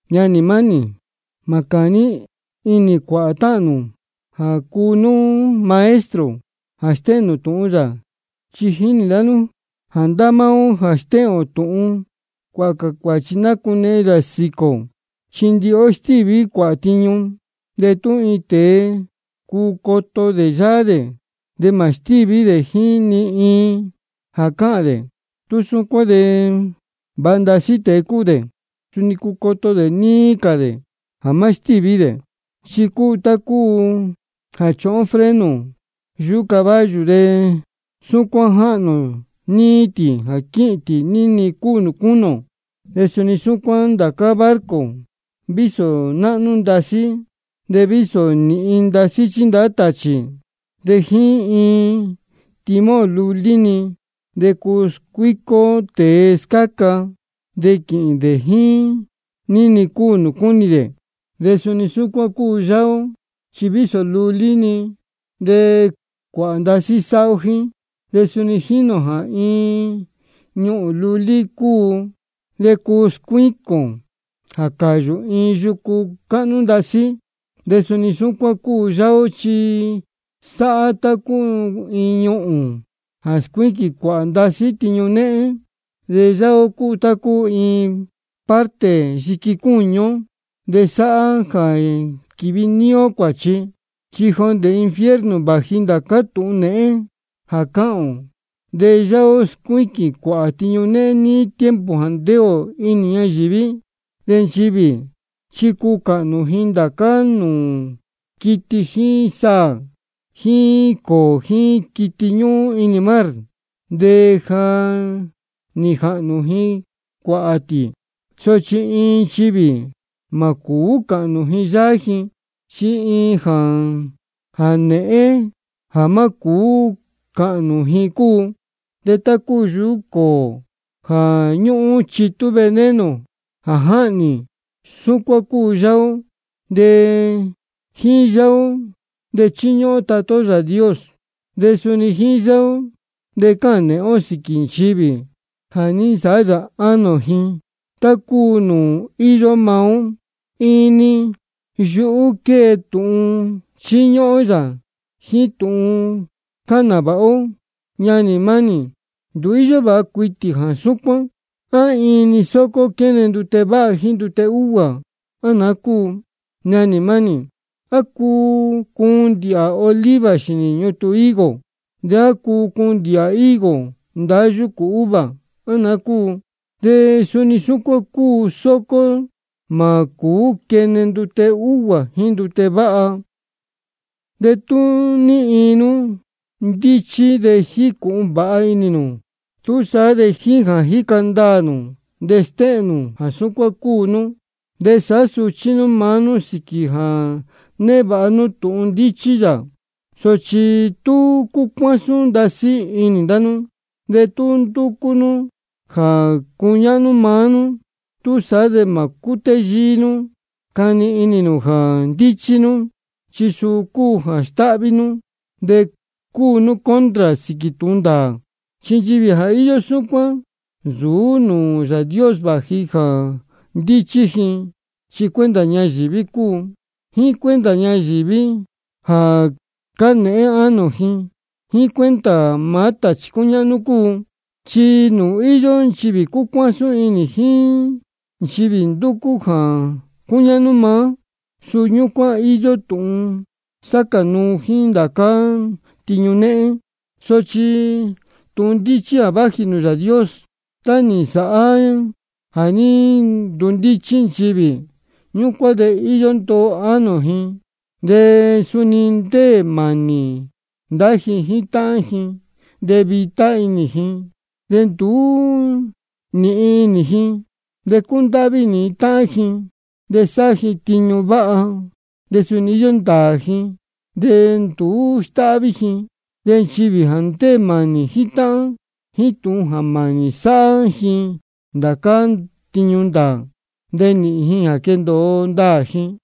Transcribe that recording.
Ñanī mánī, mā cāní inī cuāhā táhān nū jā cuu nú maestro jā stéhēn tūhun yā. Chi jínī ndá nú jā ndá máá ó jā stéhēn tūhun, cuāhā cā cuāchi nacunehen yā sīquī ō. Chi ndihi ó stíví cuāhā tiñu. De tú iin tēe cuu coto dē yáá dē jā má stíví dē jíín ni iin jā cáhān dē, tú súcuán de vāha ndasí tēe cúu dē, de suni cuu coto dē níí cā dē jā má stíví dē. Chi cúu tá cúu jā chúhún ó freno yuhú caballo, de súcuán jáhnū ō níí tī jā quīhīn tī ní-ni cúu nūū cúnī ō. De suni súcuán ndācá barco, vísō náhnú ndasí, de vísō nīhin chíndahá tāchī, de jíín iin timón lulí-ni de cuu scuícó tēe scáca, de quīhīn dē jíín ní-ni cúu nūū cúnī dē. De suni súcuán cúu yáá ó, chi vísō lulí-ni, de cuāhā ndasí sáhá ó jíín. De suni jínī ō jā iin ñuhūn lulí de cuu scuíquīn jā cāyū iin yucu cáhnú ndasí. De suni súcuán cúu yáá ó, chi sáhá tá cúu iin ñuhūn, chi scuíquīn cuāhā ndasí tiñu néhén. De yáá ó cúu iin parte lulí yiqui cúñu ó, de sáhá jā quívi níí ó cuāchi. Chi jondē infierno vāji ndācá tūhun nēhén jā cáhān ō, de yáá ó scuíquīn cuāhā tiñu néhén níí tiempo jā ndéē ō inī ñayīví. De nchivī chi cuu cāhnū ji ndācá nūū quiti jíín saā jíín cōō jíín quiti ñúhún inī mar, de ja nī jāhnū ji cuāhā tī. Sochi ni iin nchivī mā cūú cāhnū ji yáá ji. Chi iin jā nēhén jā má cūú cāhnū ji cúu. De tá cúu yuhú cōō jā ñúhún chitú veneno jā jáhnī, súcuán cúu yáá ó. De jíín yáá ó de chíñúhún ó Tatá ó Yāā Dios, de suni jíín yáá ó de cáhān nēhén ó sīquī nchivī jā ní nsāhá yā ánō ji tá cúu nūū íyó maá yā. Iin-ni yuhú quée tūhun chíñúhún ó yā jíín tūhun cáhān nāvāha ó. Ñanī mánī, nduú íyó vāha cuitī jā súcuán. ¿A iin-ni sócó quéne ndute váha jíín ndute úguā, á naá cúu? Ñanī mánī, ¿á cuu cuun ndīhā oliva xīnī ñutun higo, de á cuu cuun ndīhā higo ndahá yūcū uva, á naá cúu? De suni súcuán iin sócó mā cūú quene ndute úhguā jíín ndute váha. De tú ní iin nú ndíchí de jícūhun vāha inī nū, túsaá de jíín jā jíca ndaā nū de stéhēn nū jā súcuán cúu nú. De sāhá suchí nú maá nú sīquī jā névāha nú tūhun ndíchí yā. Sochi tú cúcuásún ndasí inī ndá nú de tú ndúcú nú jā cuñáhnú maá nú, túsaá de mā cútéyíí nú cani inī nū jā ndíchí nú. Chi suu cúu jā stáhví nú, de cúu nú contra sīquī tūhun ndāā. Chi nchivī jā íyó súcuán, nsūú nūū Yāā Dios vāji jā ndíchí ji. Chi cuenta ñayīví cúu, jíín cuenta nchivī jā cánēhén ánō ji, jíín cuenta maá tāchī cúñáhnú cúu. Chi nūū íyó nchivī cúcuásún inī jíín nchivī ndúcú jā cuñáhnú maá, suu ñúcuán íyó tūhun sácā nuu jíín ndācá tiñu néhén. Sochi tūhun ndíchí jā váji nūū Yāā Dios, tá nī nsāhá jā ní ndundíchí nchivī, ñúcuán de íyó ndoo ánō ji. De suni ndéē mānī ndá ji jíín táhán ji, de vitá inī ji, de nduú nīhin inī ji. De cúndáhví inī ji táhán ji, de sáhá ji tiñu váha. De suni íyó ndāā ji, de nduú stáhví ji. De nchivī jā ndéē mānī jíín táhán, jíín tūhun mānī sáhá ji ndācá tiñu ndāā, de nīhīn ji jā quendōo ndāā ji.